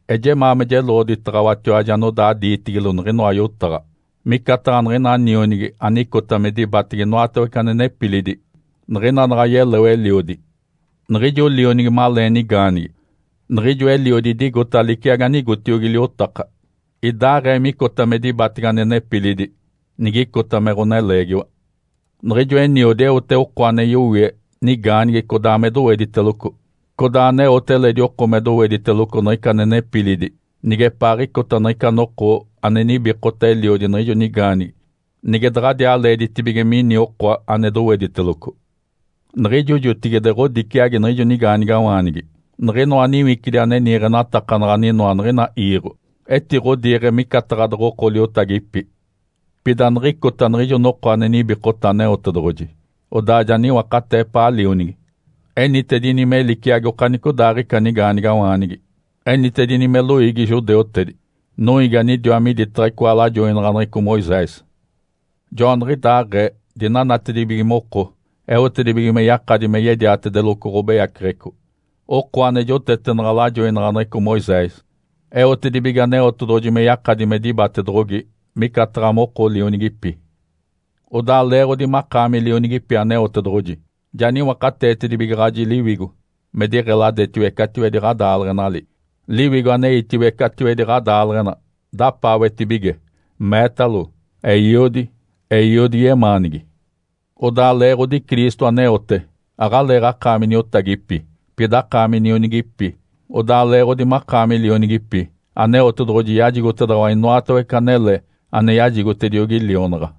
Ejemaa me jeloɡ̶oditaɡ̶awatiwaji anodaa diitigilo niɡ̶inoa yotaɡ̶a. Micataɡ̶a niɡ̶ina nionigi anicota me dibatege inoatawece ane nepilidi niɡ̶ina naɡ̶a yeleo eliodi. Niɡ̶ijo lionigi malee nigaanigi, niɡ̶ijo eliodi idigota liciagi anigotiogi liotaka, idaaɡ̶ee micota me dibatege ane nepilidi nigicota me ɡ̶oneleegiwa. Niɡ̶ijo eniodi eote oko ane yowie nigaanigi codaa me dowediteloco, codaa aneote eledi oko ane doweditelogo niɡ̶ica ane nepilidi nigepaaɡ̶icota niɡ̶ica noko ane nibikota eliodi niɡ̶ijo nigaanigi nige daɡ̶adiaa leeditibige mini oko ane dowediteloco. Niɡ̶ijo jotigide ɡ̶odiciagi niɡ̶ijo nigaanigawaanigi. Niɡ̶inoa niwicidi ane niiɡ̶enatakanaɡ̶a aninoa niɡ̶ina iiɡ̶o etiɡ̶odiiɡ̶e micataɡ̶a doɡ̶oko liotagipi. Pida niɡ̶icota niɡ̶ijo noko ane nibikota Aneotedoɡ̶oji, odaa ja niwakatee epaa Lionigi. Enitedini me liciagi okanicodaaɡ̶ica nigaanigawaanigi, enitedini me loiigi judeutedi, noiigi anidiwa miditaɡ̶a icoa lajoinaɡ̶aneɡ̶eco Moisés. Joaniɡ̶idaaɡ̶ee dinanatibige moko eotedibige me yakadi me yediatedeloco ɡ̶obeyaceɡ̶eco, oko ane jotetenaɡ̶a lajoinaɡ̶aneɡ̶eco Moisés, eotedibige Aneotedoɡ̶oji me yakadi me dibatedoɡ̶ogi micataɡ̶a moko lionigipi. Odaa leeɡ̶odi makaami lionigipi Aneotedoɡ̶oji, ja niwakateetedibigaɡ̶aji Liwigo me diɡ̶eladetiwece catiwedi ɡ̶adaaleɡ̶enali. Liwigo aneitiwece catiwedi ɡ̶adaaleɡ̶ena dapaawetibige, meetalo, “Eiodi, Eiodi yemaanigi!” Odaa leeɡ̶odi Cristo aneote, aɡ̶aleeɡ̶akaami niotagipi, pida akaami nionigipi. Odaa leeɡ̶odi makaami lionigipi, Aneotedoɡ̶oji yajigotedaɡ̶awa inoatawece anele ane yajigotediogi lionaɡ̶a.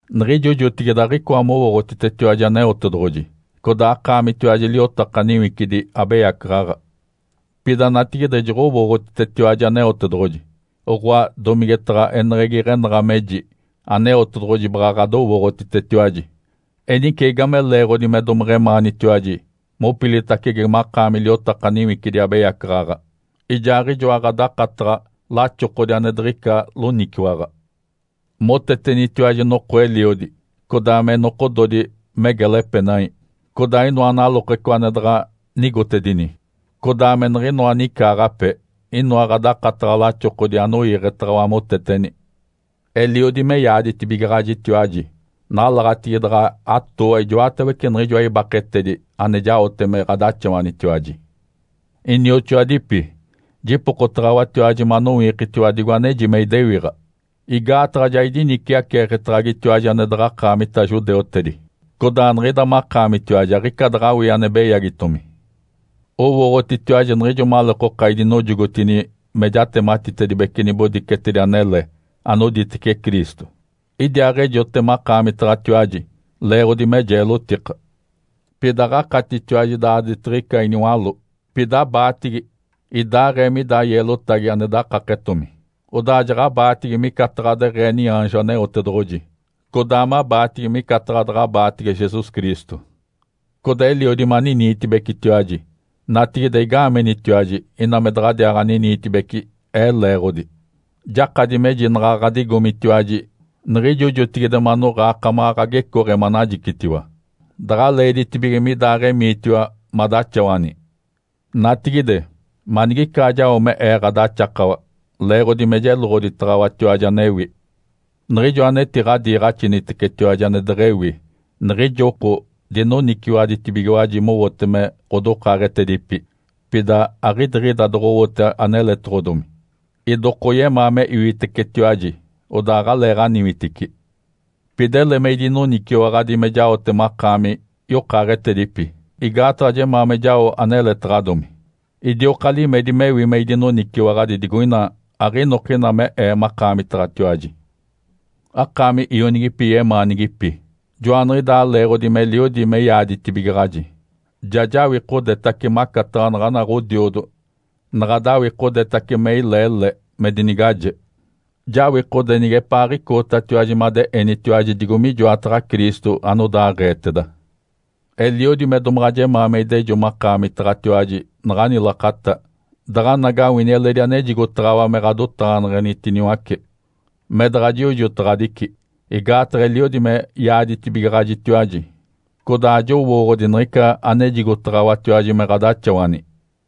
Niɡ̶ijo jotigide aɡ̶icoa mowooɡ̶otitetiwaji Aneotedoɡ̶oji. Codaa akaamitiwaji liotaka niwicidi abeyacaɡ̶aɡ̶a. Pida natigide joɡ̶owooɡ̶otitetiwaji Aneotedoɡ̶oji. Oɡ̶oa domigetaɡ̶a eneɡ̶egi iɡ̶enaɡ̶a meji Aneotedoɡ̶oji baɡ̶a ɡ̶adowooɡ̶otitetiwaji. Enice, igame leeɡ̶odi me domeɡ̶emaanitiwaji mopilitacege makaami liotaka niwicidi abeyacaɡ̶aɡ̶a ijaaɡ̶ijoa ɡ̶adakataɡ̶a laxokodi ane diɡ̶ica loniciwaɡ̶a? Motetenitiwaji noko eliodi, codaa me nokododi me gela epenai, codaa inoa nalokeco ane daɡ̶a nigotedini, codaa me niɡ̶inoa nicaaɡ̶ape inoa ɡ̶adakataɡ̶a laxokodi anoiiɡ̶etaɡ̶awa moteteni. Eliodi me yaaditibigaɡ̶ajitiwaji. Nalaɡ̶atigi daɡ̶a atooa ijoatawece niɡ̶ijoa ibakedi ane jaote me ɡ̶adaxawanitiwaji. Inioxoadipi, jipokotaɡ̶awatiwaji manowikitiwa digo aneji me idewiɡ̶a. Igaataɡ̶a ja idiniciaceeketaɡ̶agitiwaji ane daɡ̶a akaamita judeutedi. Codaa niɡ̶ida makaamitiwaji aɡ̶ica daɡ̶awii ane beyagitomi. Owooɡ̶otitiwaji niɡ̶ijo maleekoka idinojogotini me jatematitedibece nibodicetedi anele anoditece Cristo, idiaaɡ̶ejote makaamitaɡ̶atiwaji leeɡ̶odi me jeelotika. Pida aɡ̶akatitiwaji daaditiɡ̶ica iniwaló, pida abaatigi, idaaɡ̶ee mida yeelotagi ane dakaketaɡ̶adomi. Odaa jaɡ̶abaatigi micataɡ̶a deɡ̶ee niaanjo Aneotedoɡ̶oji, codaa mabaatigi micataɡ̶a daɡ̶abaatege Jesus Cristo. Codaa eliodi maniniitibecitiwaji. Natigide, igaamenitiwaji ina me daɡ̶adiaaɡ̶aniniitibeci ee leeɡ̶odi? Jakadi meji naɡ̶a ɡ̶adigomitiwaji niɡ̶ijo jotigide manoɡ̶aa akamaɡ̶a ɡ̶agecooɡ̶e manajicitiwa, daɡ̶a leeditibige midaaɡ̶emiitiwa madaxawani. Natigide, manigicaa jao me ee ɡ̶adaxakawa leeɡ̶odi me jeloɡ̶oditaɡ̶awatiwaji anewi? Niɡ̶ijo anetiɡ̶adiiɡ̶axinitecetiwaji ane deɡ̶ewi, niɡ̶ijo oko dinoniciwaɡ̶aditibigiwaji mowote me ɡ̶adokaaɡ̶etedipi, pida aɡ̶idiɡ̶ida doɡ̶owote aneletaɡ̶adomi. Idokoyemaa me iwitecetiwaji, odaa aɡ̶aleeɡ̶aniwitici. Pida ele me idinoniciwaɡ̶adi me jaote makaami yokaaɡ̶etedipi igaataɡ̶a jemaa me jao aneletaɡ̶adomi. Idioka limedi mewi me idinoniciwaɡ̶adi digoina aɡ̶inokina me ee makaamitaɡ̶atiwaji. Akaami ionigipi yemaanigipi! Joaniɡ̶idaa leeɡ̶odi meliodi me yaaditibigaɡ̶aji, ja jawikodetace, macataɡ̶a naɡ̶ana ɡ̶odiodo naɡ̶a dawikodetace me ilee le me dinigaje. Jawikode nigepaaɡ̶icootatiwaji made enitiwaji digo mijoataɡ̶a Cristo anodaaɡ̶eeteda. Eliodi me domaɡ̶a jemaa me idejo makaamitatiwaji naɡ̶ani lakata daɡ̶anagawini eledi anejigotaɡ̶awa me ɡ̶adotaɡ̶aneɡ̶enitiniwace, me daɡ̶a jiojotaɡ̶adici. Igaataɡ̶a eliodi me yaaditibigaɡ̶ajitiwaji, codaa ajowooɡ̶odi niɡ̶ica anejigotaɡ̶awatiwaji me ɡ̶adaxawani.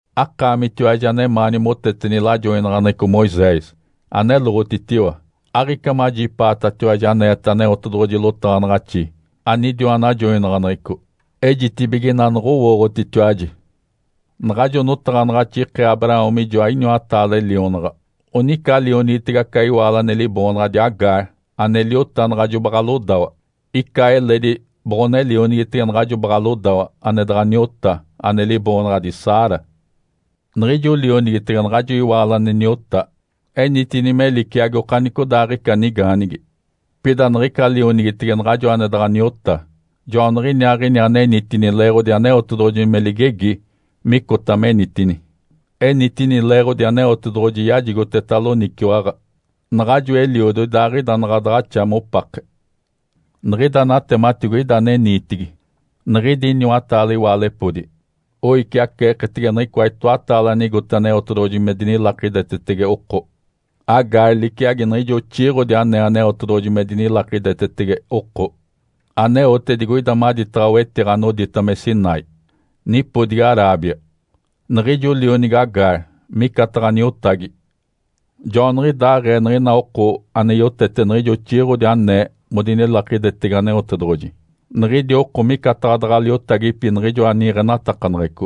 Akaamitiwaji anemaani moteteni lajoinaɡ̶aneɡ̶eco Moisés, aneloɡ̶otitiwa! Aɡ̶ica majipaatatiwaji aneeta Aneotedoɡ̶oji lotaɡ̶anaɡ̶axi anidiwa najoinaɡ̶aneɡ̶eco? Ejitibige ina noɡ̶owooɡ̶otitiwaji. Naɡ̶ajo notaɡ̶anaɡ̶axi ikee Abraão mijoa iniwataale lionaɡ̶a. Onica lionigitege aca iwaalo ane liboonaɡ̶adi Agar ane liota naɡ̶ajo baɡ̶a lodawa. Ica eledi boɡ̶one lionigitege naɡ̶ajo baɡ̶a lodawa ane daɡ̶a niota, ane liboonaɡ̶adi Sara. Niɡ̶ijo lionigitege naɡ̶ajo iwaalo ane niota enitini me liciagi okanicodaaɡ̶ica nigaanigi. Pida niɡ̶ica lionigitege naɡ̶ajo ane daɡ̶a niota joaniɡ̶iniaaɡ̶ini ane enitini leeɡ̶odi Aneotedoɡ̶oji me ligegi micota menitini, enitini leeɡ̶odi Aneotedoɡ̶oji yajigoteta loniciwaɡ̶a naɡ̶ajo eliodo idaaɡ̶ida naɡ̶a daɡ̶axa mopake. Niɡ̶ida natematigo ida ane niitigi. Niɡ̶idi iniwataale iwaalepodi oiciaceeketege niɡ̶icoa itoataale anigote Aneotedoɡ̶oji me dinilakidetetege oko. Agar liciagi niɡ̶ijo oxiiɡ̶odi anee Aneotedoɡ̶oji me dinilakidetetege oko, aneote digoida maditaɡ̶a wetiɡ̶a anodita me Sinai, nipodigi Arábia. Niɡ̶ijo lionigi Agar micataɡ̶a niotagi. Joaniɡ̶idaaɡ̶ee niɡ̶ina oko ane yotete niɡ̶ijo oxiiɡ̶odi anee modinilakidetetege Aneotedoɡ̶oji, niɡ̶idi oko micataɡ̶a daɡ̶a liotagipi niɡ̶ijoa niiɡ̶enatakaneɡ̶eco.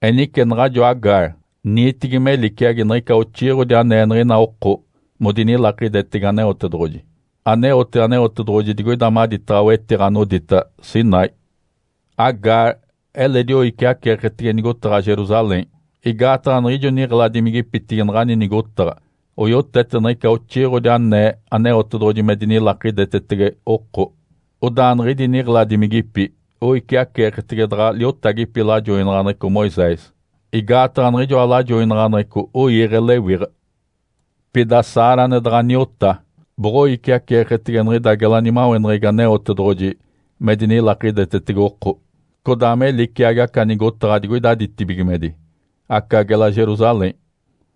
Enice naɡ̶ajo Agar niitigi me liciagi niɡ̶ica oxiiɡ̶odi anee niɡ̶ina oko modinilakidetetege Aneotedoɡ̶oji, aneote Aneotedoɡ̶oji digoida maditaɡ̶a wetiɡ̶a anodita Sinai. Agar eledi oiciaceeketege nigotaɡ̶a Jerusalém, igaataɡ̶a niɡ̶ijo niɡ̶eladimigipitigi naɡ̶ani nigotaɡ̶a oyotete niɡ̶ica oxiiɡ̶odi anee Aneotedoɡ̶oji me dinilakidetetege oko, odaa niɡ̶idi niɡ̶eladimigipi oiciaceeketege daɡ̶a liotagipi lajoinaɡ̶aneɡ̶eco Moisés, igaataɡ̶a niɡ̶ijoa lajoinaɡ̶aneɡ̶eco oiiɡ̶e lewiɡ̶a. Pida Sara ane daɡ̶a niota, boɡ̶oiciaceeketege niɡ̶ida gela nimaweneɡ̶egi Aneotedoɡ̶oji me dinilakidetetege oko, codaa me liciagi aca nigotaɡ̶a digoida ditibigimedi, aca gela Jerusalém.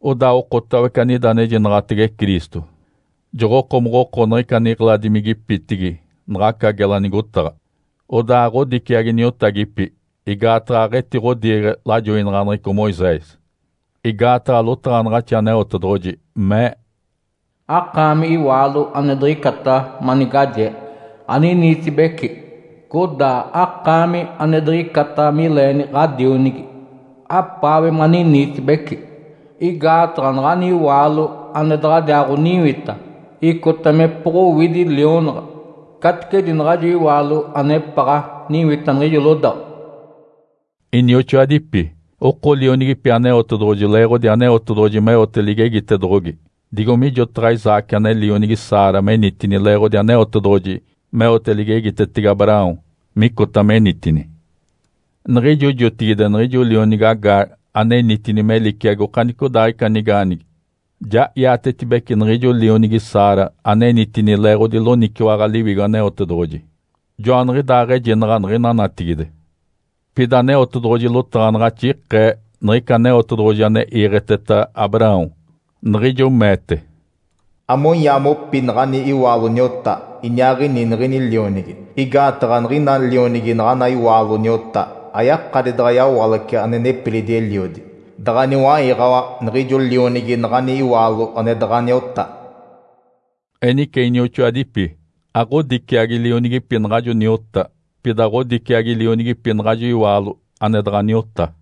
Odaa okotawece anida anejinaɡ̶atege Cristo joɡ̶okomoɡ̶oko niɡ̶ica niɡ̶eladimigipitigi naɡ̶aca gela nigotaɡ̶a, odaa aɡ̶odiciagi niotagipi, igaataɡ̶a aɡ̶etiɡ̶odiiɡ̶e lajoinaɡ̶aneɡ̶eco Moisés. Igaataɡ̶a lotaɡ̶anaɡ̶axi Aneotedoɡ̶oji mee, “Akaami, iwaalo ane diɡ̶icata manigajee, aniniitibeci! Codaa akaami, ane diɡ̶icata mileeni ɡ̶adionigi, apaawe maniniitibeci! Igaataɡ̶a naɡ̶ani iwaalo ane daɡ̶adiaaɡ̶oniwita icota mepoɡ̶owidi lionaɡ̶a caticedi naɡ̶ajo iwaalo anepaɡ̶a niwita niɡ̶ijo lodawa.” Inioxoadipi, oko lionigipi Aneotedoɡ̶oji leeɡ̶odi Aneotedoɡ̶oji meote ligegitedoɡ̶ogi, digo mijotaɡ̶a Isaque ane lionigi Sara menitini leeɡ̶odi Aneotedoɡ̶oji meote ligegitetege Abraão micota menitini. Niɡ̶ijo jotigide niɡ̶ijo lionigi Agar anenitini me liciagi okanicodaaɡ̶ica nigaanigi ja iatetibeci niɡ̶ijo lionigi Sara anenitini leeɡ̶odi loniciwaɡ̶a Liwigo Aneotedoɡ̶oji. Joaniɡ̶idaaɡ̶ejinaɡ̶a niɡ̶ina natigide. Pida Aneotedoɡ̶oji lotaɡ̶anaɡ̶axi ikee niɡ̶ica Aneotedoɡ̶oji ane iiɡ̶eteta Abraão, niɡ̶ijo meete, “Amonyaa mopi naɡ̶ani iwaalo niota, iniaaɡ̶ini niɡ̶ini lionigi! Igaataɡ̶a niɡ̶ina lionigi naɡ̶ana iwaalo niota ayakadi daɡ̶a yawalace ane nepilidi eliodi daɡ̶a niwaiɡ̶awa niɡ̶ijo lionigi naɡ̶ani iwaalo ane daɡ̶a niota.” Enice, inioxoadipi, aɡ̶odiciagi lionigipi naɡ̶ajo niota, pida ɡ̶odiciagi lionigipi naɡ̶ajo iwaalo ane daɡ̶a niota.